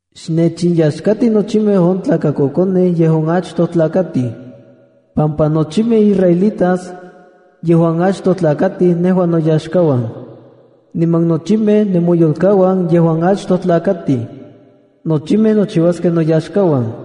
“Xnechinyaxkati nochimej on tlakakokonej yejuan achtoj tlakatij, pampa nochimej israelitas yejuan achtoj tlakatij nejua noyaxkauan, niman no nochimej nemoyolkauan yejuan achtoj tlakatij. Nochimej nochiuaskej noyaxkauan.”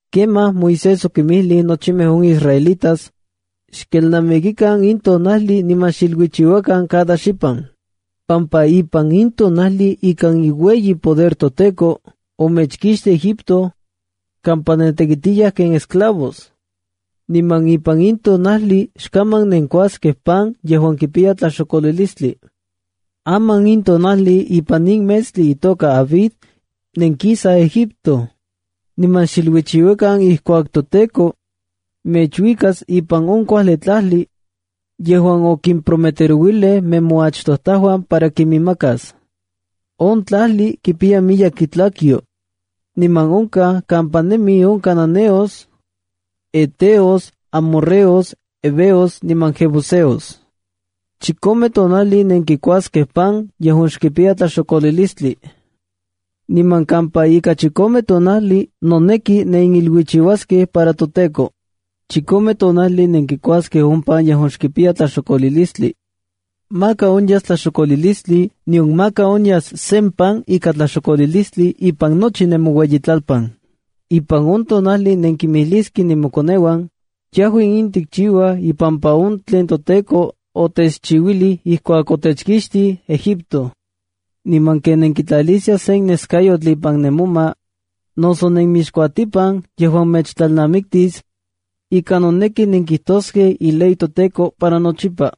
Kemaj Moisés okinmijlij nochimej on israelitas: “Xkelnamikikan in tonajli niman xiluichiuakan cada xipan, pampa ipan in tonajli ikan iueyi poder toTEKO omechkixtij Egipto kampa nentekitiyaj ken esclavos. Niman ipan in tonajli xkaman nenkuaskej pan yejuan kipiya tlaxokolilistli. Aman in tonajli ipan in metstli itoka Abiba nenkisaj Egipto. Niman xiluichiuakan ijkuak toTEKO mechuikas ipan on kuajli tlajli yejuan okimprometerouilij nemoachtojtajuan para kiminmakas. On tlajli kipiya miyek itlakyo niman onkaj kampa nemij on cananeos, heteos, amorreos, heveos niman jebuseos. Chikome tonajli nenkikuaskej pan yejuan xkipiya tlaxokolilistli. Niman kampa ika chikome tonajli noneki neniluichiuaskej para toTEKO. Chikome tonajli nenkikuaskej on pan yejuan xkipiya tlaxokolilistli. Maka onyas tlaxokolilistli, nion maka onyas sen pan ika tlaxokolilistli ipan nochi nemoueyitlalpan. Ipan on tonajli nenkimijliskej nemokoneuan yejua in tikchiuaj ipampa on tlen toTEKO otechchiuilij ijkuak otechkixtij Egipto. Niman ken nenkitlaliskiaj sen neskayotl ipan ne moma noso nenmixkuatipan yejuan mechtlalnamiktis ika noneki nenkijtoskej iley toTEKO para nochipa,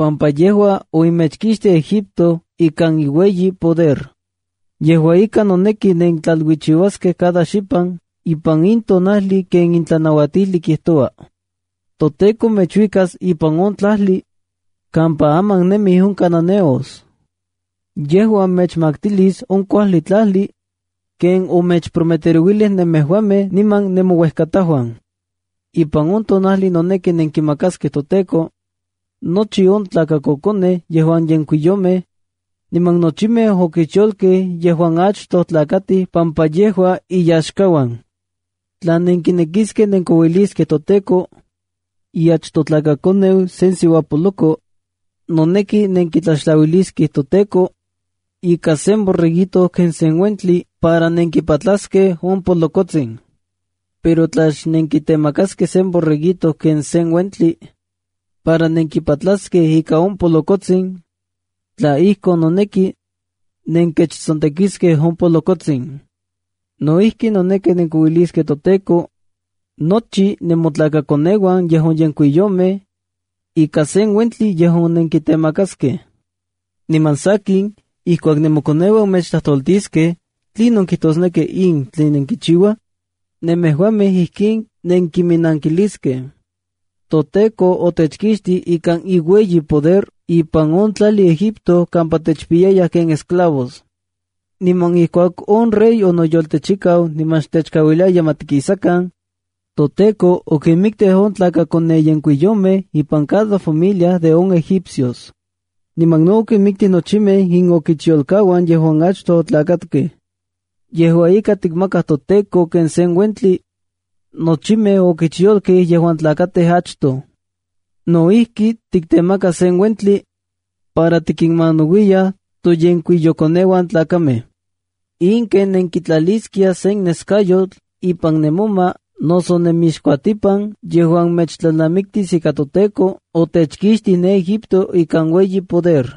pampa yejua omechkixtij Egipto ikan iueyi poder. Yejua ika, noneki nentlailuichiuaskej cada xipan ipan in tonajli ken in tlanauatijli kijtoua. ’ToTEKO mechuikas ipan on tlajli kampa aman nemij on cananeos. Yejua mechmaktilis on kuajli tlajli ken omechprometerouilij nemejuamej niman nemouejkatajuan. Ipan on tonajli noneki nenkimakaskej toTEKO nochi on tlakakokonej yejuan yenkuiyomej niman nochimej okichyolkej yejuan achtoj tlakatij pampa yejua iyaxkauan. Tla nenkinekiskej nenkouiliskej toTEKO iachtojtlakakoneu sen siuapoloko, noneki nenkitlaxtlauiliskej toTEKO ika sen borreguito ken sen uentli para nenkipatlaskej on polokotsin. Pero tla xnenkitemakaskej sen borreguito ken sen uentli para nenkipatlaskej ika on polokotsin, tla ijkon, noneki nenkechsontekiskej on polokotsin. No ijki, noneki nenkikouiliskej toTEKO nochi nemotlakakoneuan yejuan yenkuiyomej ika sen uentli yejuan nenkitemaskej. Niman sakin, ijkuak nemokoneuan mechtlajtoltiskej: ‘¿Tlinon kijtosneki in tlen nenkichiuaj?’, nemejuamej ijkin nenkiminankiliskej: ‘ToTEKO otechkixtij ikan iueyi poder ipan on tlajli Egipto kampa techpiyayaj ken esclavos.’ Niman ijkuak on rey onoyoltechikau niman xtechkauiliaya ma tikisakan, toTEKO okinmiktij on tlakayenkuiyomejb ipan cada familia de on egipcios. Niman no okinmiktij nochimej inokichyolkauan yejuan achtoj otlakatkej. Yejua ika, tikmakaj toTEKO ken sen uentli nochimej okichyolkej yejuan tlakatij achtoj. No ijki, tiktemakaj sen uentli para tikinmanauiyaj toyenkuiyokoneuan tlakamej. In ken nenkitlaliskiaj sen neskayotl ipan nemoma noso nemixkuatipan yejuan mechtlalnamiktis ika toTEKO otechkixtij ne Egipto ikan ueyi poder.”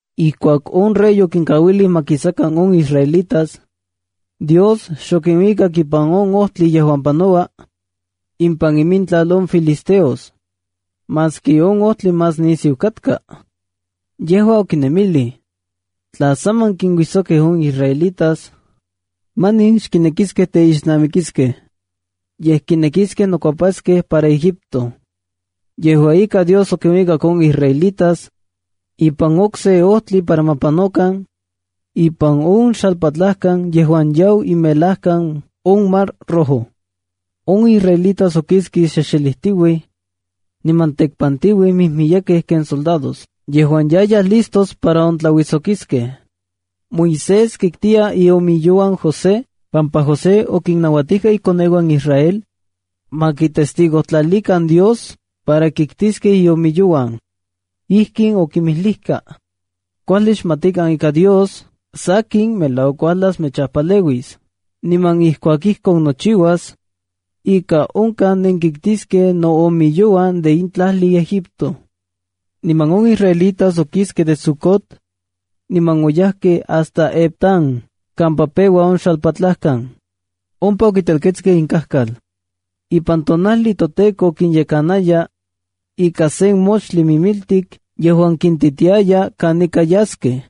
Ijkuak on rey okinkauilij ma kisakan on israelitas, Dios xokinuikak ipan on ojtli yejuan panoua ipan imintlal on filisteos, maski on ojtli más nisiu katka. Yejua okinemilij: “Tla saman kinuijsokij on israelitas, manin xkinekiskej teixnamikiskej, yej kinekiskej nokuepaskej para Egipto.” Yejua ika, Dios okinuikak on israelitas ipan okse ojtli para ma panokan ipan on xalpatlajkan yejuan yau imelajkan on Mar Rojo. On israelitas okiskej xexelijtiuij niman tekpantiuij mijmiyekej ken soldados, yejuan yayaj listos para ontlauijsokiskej. Moisés kiktiya iomiyouan José, pampa José okinnauatijka ikoneuan Israel ma kitestigojtlalikan Dios para kiktiskej iomiyouan. Ijkin okinmijlijka: “Kuajli xmatikan ika Dios sakin melauak uajlas mechajpaleuis. Niman ijkuak ijkon nochiuas, ika onkaj nenkiktiskej noomiyouan de in tlajli Egipto.” Niman on israelitas okiskej de Sucot, niman oyajkej hasta Etam kampa peua on xalpatlajkan. Ompa okintelketskej inkajkal. Ipan tonajli toTEKO kinyekanaya ika sen moxtli mimiltik yejuan kintitiaya kanika yaskej.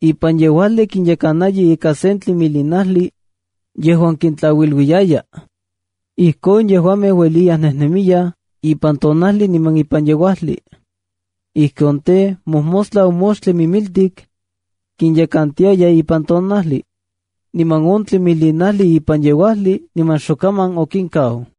Ipan yeuajli kinyekanaya ika sen tlimilinajli yejuan kintlauiluiyaya. Ijkon yejuamej ueliyaj nejnemiyaj ipan tonajli niman ipan yeuajli. Ijkon tej, mojmostla on moxtli mimiltik kinyekantiaya ipan tonajli, niman on tlimilinajli ipan yeuajli niman xokaman okinkau.